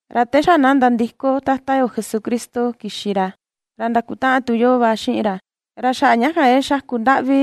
Ra te xa na nandiko Tata yo Jesucristo kixi ra, ra ndakutaꞌan tu yoo va xiꞌin ra. Ra xaꞌa ña kan ke xaku ndaꞌvi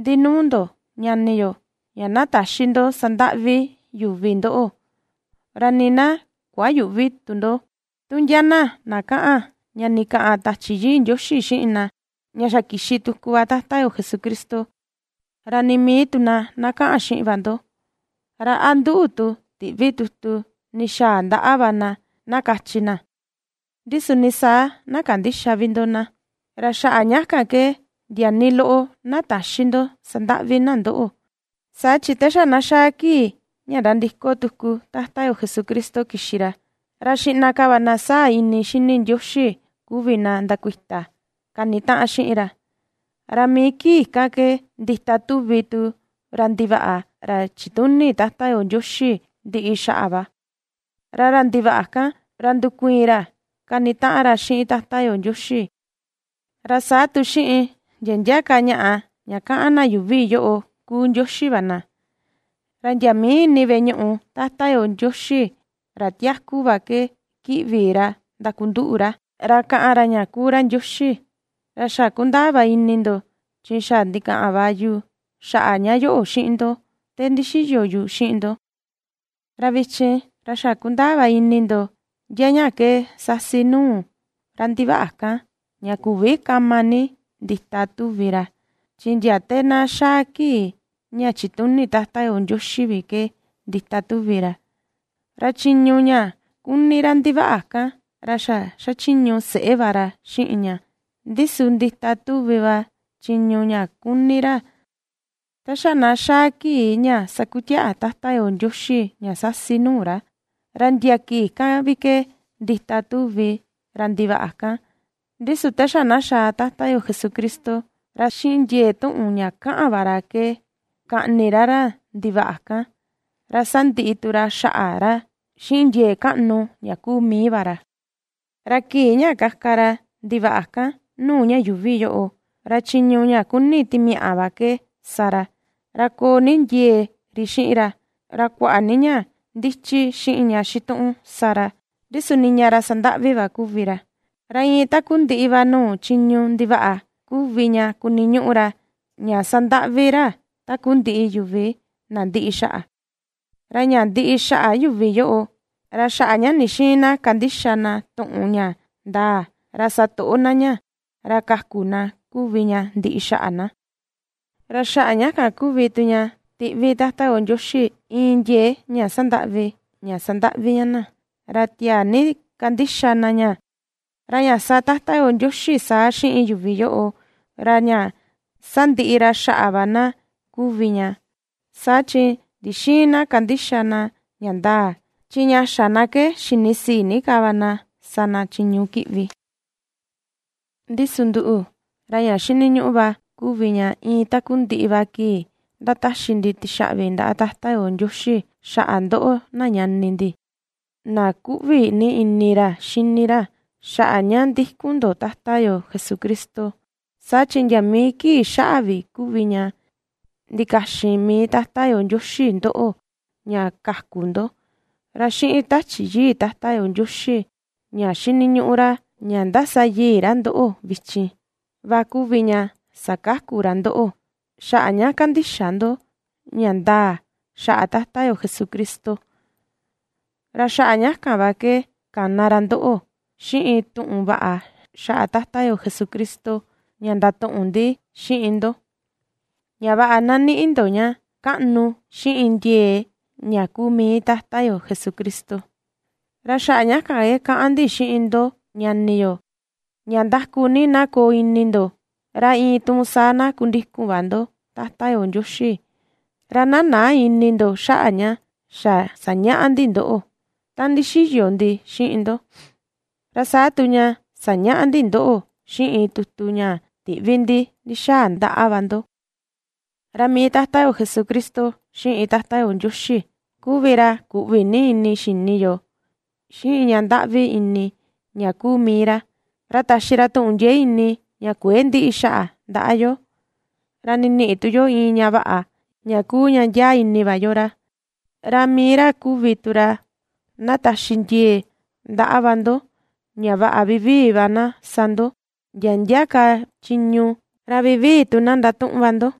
ndi nuu ndo ñani yo, ña na täxi ndo sandaꞌvi yuvi ndoꞌo. Ra nii na kuayüꞌvi tu ndo, tu ndia na na kaꞌan ña ndikaꞌan Tachi Yii Ndioxi xiꞌin na, ña xa kixi tuku va Tata yo Jesucristo, ra nii mii tu na na kaꞌan xiꞌin va ndo, ra a nduꞌu tu tiꞌvi tutu ndixaa ndaꞌa va na na kachi na, ndi su nii saa na kandïxa vi ndo na. Ra xaꞌa ña kan ke ndia nii loꞌo na täxi ndo sandaꞌvi na ndoꞌo. Saa chi te xa na xaa kii ña nandiko tuku Tata yo Jesucristo kixi ra, ra xiꞌna ka va na sáa̱ ini xini Ndioxi kuvi na ndakuita kanitaꞌan xiꞌin ra, ra mii kii kan ke ndita tuvi tu ra ndivaꞌa ra chituni Tata yo Ndioxi ndiꞌi xaꞌa va. Ra ra ndivaꞌa kan, ra ndukuiin ra kanitaꞌan ra xiꞌin Tata yo Ndioxi, ra saa tu xiꞌin ndia ndia ka ñaꞌa ña kaꞌan na yuuvi yoꞌo kuu ndioxi va na; ra ndia mii ini veꞌe ñuꞌu Tata yo Ndioxi ra tiaku va ke kiꞌvi ra ndakunduꞌu ra, ra kaꞌan ra ña kuu ra Ndioxi. Ra xa kundaa va ini ndo chi xa ndikaꞌan va yu xaꞌa ña yoꞌo xiꞌin ndo te ndixiyo yu xiꞌin ndo. Ra vichin, ra xa kundaa va ini ndo ndia ña ke sasi nuu ra ndivaꞌa kan ña küvi kama ni ndita tuvi ra, chi ndia te na xaa kii ña chituni Tata yo Ndioxi vi ke ndita tuvi ra. Ra chiñu ña kuni ra ndivaꞌa kan ra xa xachiñu seꞌé va ra xiꞌin ña, ndi su ndita tuvi va chiñu ña kuni ra ta xa na xaa kii ña sakutiaꞌa Tata yo Ndioxi ña sasi nuu ra. Ra ndia kii kan vi ke ndita tuvi ra ndivaꞌa kan, ndi su te xa na xaa Tata yo Jesucristo, ra xiꞌin ndiee tuꞌun ña kaꞌan va ra ke kaꞌni ra ra ndivaꞌa kan, ra sandiꞌi tu ra xaꞌa ra xiꞌin ndiee kaꞌnu ña kuu mii va ra. Ra kii ña kaka ra ndivaꞌa kan nuu ña yuuvi yoꞌo, ra chiñu ña kuni timiaꞌa va ke sa ra, ra koo ni ndiee ri xiꞌin ra, ra kuaꞌa ni ña ndichi xiꞌin ña xituꞌun sa ra, ndi su niña ra sandaꞌvi va kuvi ra. Ra iin takundiꞌi va nuu chiñu ndivaꞌa kuvi ña kuniñuꞌu ra ña sandaꞌvi ra takundiꞌi yuvi na ndiꞌi xaꞌa, ra ña ndiꞌi xaꞌa yuvi yoꞌo, ra xaꞌa ña ndixïin na kandixa na tuꞌun ña ndaa, ra satoꞌo na ña ra kaku na kuvi ña ndiꞌi xaꞌa na. Ra xaꞌa ña kan kuvi tu ña tiꞌvi Tata yo Ndioxi iin ndiee ña sandaꞌvi, ña sandaꞌvi ña na, ra tiaa ni kandixa na ña. Ra ña sa Tata yo Ndioxi saa xiꞌin yuvi yoꞌo, ra ña sandiꞌi ra xaꞌa va na kuvi ña, saa chi ndixïin na kandixa na ña ndaa, chi ña xa na ke xinisii ni ka va na sa na chiñu kiꞌvi. Ndi su nduꞌu, ra ña xiniñuꞌu va kuvi ña iin takundiꞌi va kii ^ndataxi ndi tixaꞌvi ndaꞌa Tata yo Ndioxi xaꞌa ndoꞌo na ñani ndi, na ^kuꞌvi ni ini ra xini ra xaꞌa ña ndikun ndo Tata yo Jesucristo, saa chi ndia mii kii xaꞌa vi kuvi ña ndikaxin mii Tata yo Ndioxi ndoꞌo ña kaku ndo; ra xiꞌin Tachi Yii Tata yo Ndioxi ña ^xiniñuꞌu ra ña ^ndasayii ra ndoꞌo vichin, va kuvi ña sakaku ra ndoꞌo, xaꞌa ña kandixa ndo ña ndaa xaꞌa Tata yo Jesucristo. Ra xaꞌa ña kan va ke kana ra ndoꞌo, xiꞌin tuꞌun vaꞌa xaꞌa Tata yo Jesucristo ña ndatuꞌun ndi xiꞌin ndo, ña vaꞌa na niꞌi ndo ña kaꞌnu xiꞌin ndiee ña kuu mii Tata yo Jesucristo. Ra xaꞌa ña kan ke kaꞌan ndi xiꞌin ndo ñani yo, ña ndaku ni na koo ini ndo, ra iin tuun saa na kundikun va ndo Tata yo Ndioxi, ra na näa ini ndo xaꞌa ña xa sañaꞌa ndi ndoꞌo ta ndixiyo ndi xiꞌin ndo, ra saa tu ña sañaꞌa ndi ndoꞌo xiꞌin tutu ña tiꞌvi ndi ndixaa ndaꞌa va ndo. Ra mii Tata yo Jesucristo xiꞌin Tata yo Ndioxi kuvi ra kuꞌvi ni ini xini yoo xiꞌin ña ndaꞌvi ini ña kuu mii ra, ra taxi ra tuꞌun ndiee ini ña kuëe ndiꞌi xaꞌa ndaꞌa yo, ra ndiniꞌi tu yo iin ña vaꞌa, ña kuu ña ndiaa ini va yo ra. Ra mii ra kuvi tu ra na taxi ndiee ndaꞌa va ndo, ña vaꞌa vivii va na sa ndo ndia ndia ka chiñu, ra vivii tu na ndatuꞌun va ndo.